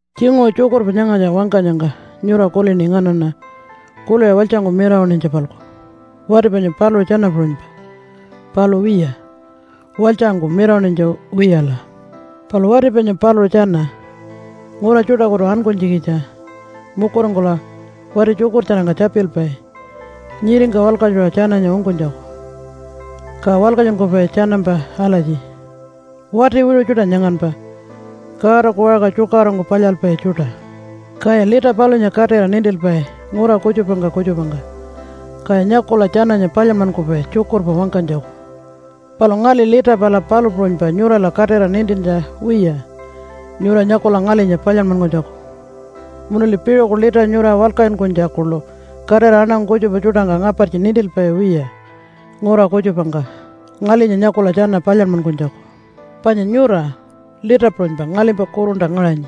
Tjinguṟu tjukurpa nyangatja wangkanyangka nyura kulini nganaṉa kuliṟa walytjangku mirawaṉinytja-palku wati panya paluṟu tjana puṟunypa. Palu wiya, walytjangku mirawaṉinytja wiyala. Palu wati panya paluṟu tjana ngura tjuṯakutu ankunytjikitja mukuringkula wati tjukurtjarangka tjapilpai nyiringka walkatjuṟa tjananya ungkunytjaku, ka walkatjunkupai tjanampa alatji, “Wati wiṟu tjuṯa nyanganpa, Godaku waṟka tjukaṟurungku palyalpai tjuṯa.” Kaya lita palunya katira nintilpai ngura kutjupangka kutjupangka, kaya nyakula tjananya palyanmankupai tjukurpa wangkanytjaku. Palu ngali lita pala palu puṟunypa nyurala katira nintintja wiya nyura nyakula ngalinya palyanmankunytjaku. Munuli piṟuku lita nyura walkatjunkunytja kuḻu katira aṉangu kutjupa tjuṯangka ngapartji nintilpai wiya ngura kutjupangka ngalinya nyakula tjana palyanmankunytjaku. Panya nyura lita puṟunypa ngalimpa kurunta ngaṟanyi,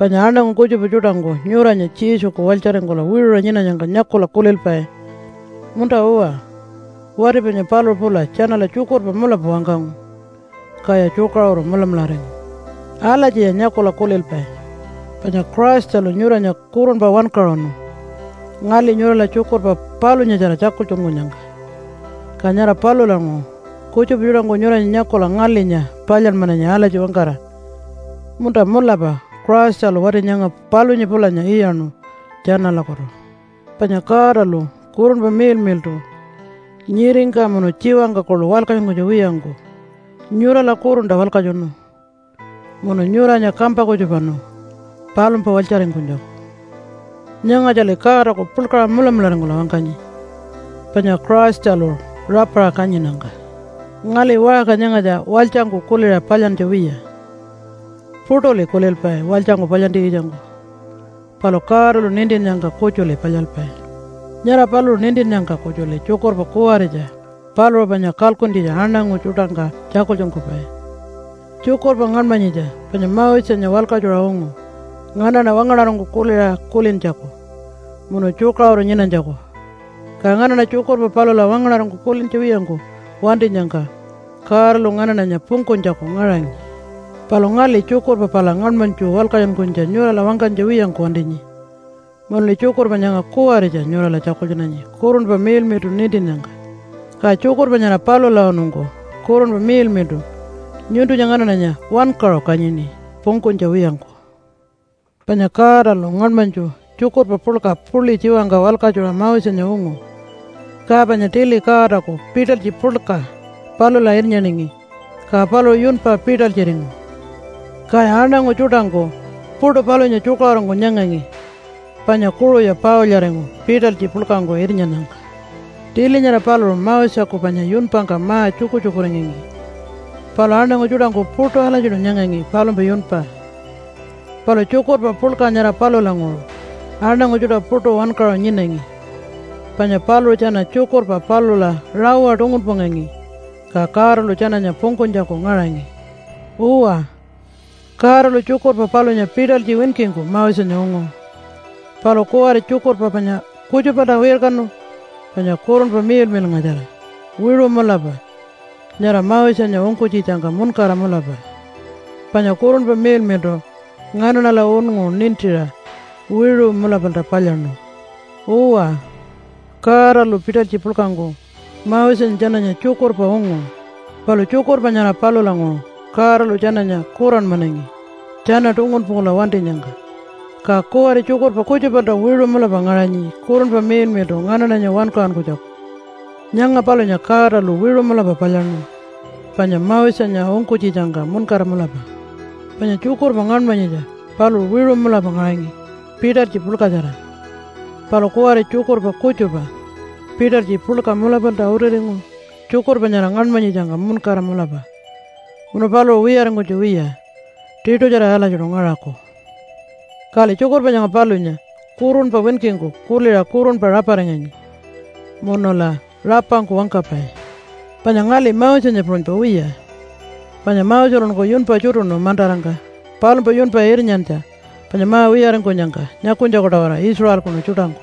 panya aṉangu kutjupa tjuṯangku nyuranya Jesuku walytjaringkula wiṟuṟa nyinanyangka nyakula kulilpai, “Munta-uwa, wati panya paluṟu pula tjanala tjukurpa mulapa wangkangu, kaya tjukaṟuru mulamularingu.” Alatjiya nyakula kulilpai. Panya Christalu nyuranya kurunpa wankaṟunu ngali nyurala tjukurpa palunyatjara tjakultjunkunyangka, ka nyara palulanguṟu kutjupa tjuṯangku nyuranya nyakula ngalinya palyanmananyi alatji wangkara, “Munta mulapa Christalu wati nyanga palunya pulanya iyaṉu tjanalakutu.” Panya Godalu Kurunpa Miḻmiḻṯu nyiringka munu tjiwangka kuḻu walkatjunkunytja wiyangku nyurala kurunta walkatjunu munu nyuranya kampa kutjupanu palumpa walytjaringkunytjaku. Nyangatjali Godaku puḻkaṟa mulamularingkula wangkanyi panya Christalu rapaṟa kanyinnyangka. Ngali waṟka nyangatja walytjangku kuliṟa palyantja wiya. Puṯuli kulilpai walytjangku palyantjikitjangku, palu Godalu nintinnyangka kutjuli palyalpai. Nyara paluṟu nintinnyangka kutjuli tjukurpa kuwaritja paluṟu panya kalkuntjitja aṉangu tjuṯangka tjakultjunkupai. Tjukurpa ngaṉmanyitja panya Mosenya walkatjuṟa ungu nganaṉa wangaṉarangku kuliṟa kulintjaku munu tjukaṟuru nyinanytjaku, ka nganaṉa tjukurpa palula wangaṉarangku kulintja wiyangku wantinyangka Godalu nganaṉanya pungkunytjaku ngaṟanyi. Palu ngali tjukurpa pala ngaṉmanytju walkatjunkunytja nyurala wangkanytja wiyangku wantinyi munuli tjukurpa nyanga kuwaritja nyurala tjakultjunanyi Kurunpa Miḻmiḻṯu nintinnyangka, ka tjukurpa nyara palulawanungku Kurunpa Miḻmiḻṯu nyuntunya nganaṉanya wankaṟu kanyini pungkunytja wiyangku. Panya Godalu ngaṉmanytju tjukurpa puḻka puḻi tjiwangka walkatjuṟa Mosenya ungu, ka panya tili Godaku pitalytji puḻka palula irnyaningi ka paluṟu yunpa pitalytjiringu. Kaya aṉangu tjuṯangku puṯu palunya tjukaṟurungku nyangangi panya kuṟuya paulyaringu pitalytji puḻkangku irnyannyangka. Tili nyara paluṟu Moseku panya yunpangka ma-tjukutjukuringangi palu aṉangu tjuṯangku puṯu alatjiṯu nyangangi palumpa yunpa. Palu tjukurpa puḻka nyara palulanguṟu aṉangu tjuṯa puṯu wankaṟu nyinangi, panya paluṟu tjana tjukurpa palula rawa tungunpungangi ka Godalu tjananya pungkunytjaku ngaṟangi. Uwa, Godalu tjukurpa palunya pitalytji winkingku Mosenya ungu, palu kuwari tjukurpa panya kutjupalta wirkanu panya Kurunpa Miḻmiḻngatjara wiṟu mulapa nyara Mosenya ungkunytjitjangka muṉkara mulapa, panya Kurunpa Miḻmiḻṯu nganaṉala unngu nintiṟa wiṟu mulapalta palyaṉu. Uwa, Godalu pitalytji puḻkangku Mosenya tjananya tjukurpa ungu, palu tjukurpa nyara palulanguṟu Godalu tjananya kuranmanangi tjana tungunpungkula wantinyangka. Ka kuwari tjukurpa kutjupalta wiṟu mulapa ngaṟanyi Kurunpa Miḻmiḻṯu nganaṉanya wankaṟunkunytjaku. Nyanga palunya Godalu wiṟu mulapa palyaṉu panya Mosenya ungkunytjitjangka muṉkara mulapa. Panya tjukurpa ngaṉmanyitja paluṟu wiṟu mulapa ngaṟangi pitalytji puḻkatjara. Palu kuwari tjukurpa kutjupa pitalytji puḻka mulapalta utiringu tjukurpa nyara ngaṉmanyitjangka muṉkara mulapa, munu paluṟu wiyaringkunytja wiya tiṯutjara alatjiṯu ngaṟaku. Kali tjukurpa nyanga palunya kurunpa winkingku kuliṟa kurunpa raparinganyi munula rapangku wangkapai. Panya ngali Mosenya puṟunypa wiya, panya Moselunku yunpa tjutuṉu mantarangka palumpa yunpa irnyantja panya ma-wiyaringkunyangka nyakunytjaku-tawara Israelkunu tjuṯangku.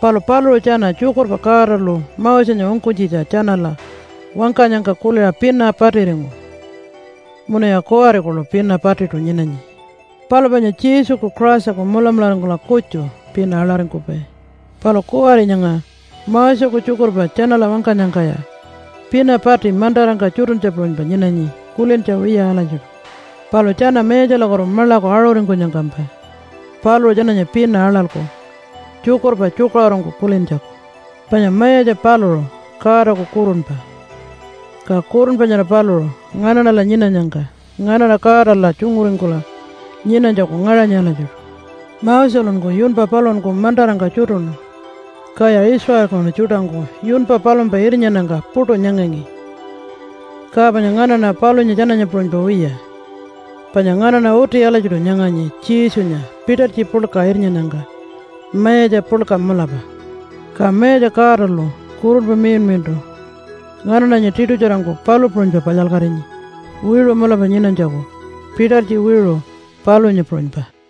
Palu paluṟu tjana tjukurpa Godalu Mosenya ungkunytjitja tjanala wangkanyangka kuliṟa pina patiringu. Munuya kuwari kuḻu pina patiṯu nyinanyi. Palu panya Jesuku Christaku mulamularingkula kutju pina aḻaringkupai. Palu kuwari nyanga Moseku tjukurpa tjanala wangkanyangkaya pina pati mantarangka tjutuntja puṟunypa nyinanyi kulintja wiya alatjiṯu. Palu tjana Mayatjalakutu maḻaku aṟuringkunyangkampa paluṟu tjananya pina aḻalku tjukurpa tjukaṟurungku kulintjaku. Panya Mayatja paluṟu Godaku Kurunpa, ka Kurunpa nyara paluṟu nganaṉala nyinanyangka nganaṉa Godala tjunguringkula nyinanytjaku ngaṟanyi alatjiṯu. Moselunku yunpa paluṟunku mantarangka tjutuṉu, kaya Israelkunu tjuṯangku yunpa palumpa irnyannyangka puṯu nyangangi. Ka panya nganaṉa palunya tjananya puṟunypa wiya, panya nganaṉa uti alatjiṯu nyanganyi Jesunya pitalytji puḻka irnyannyangka mayatja puḻka mulapa. Ka Mayatja Godalu Kurunpa Miḻmiḻṯu nganaṉanya tiṯutjarangku palu puṟunypa palyalkatinyi wiṟu mulapa nyinanytjaku pitalytji wiṟu palunya puṟunypa.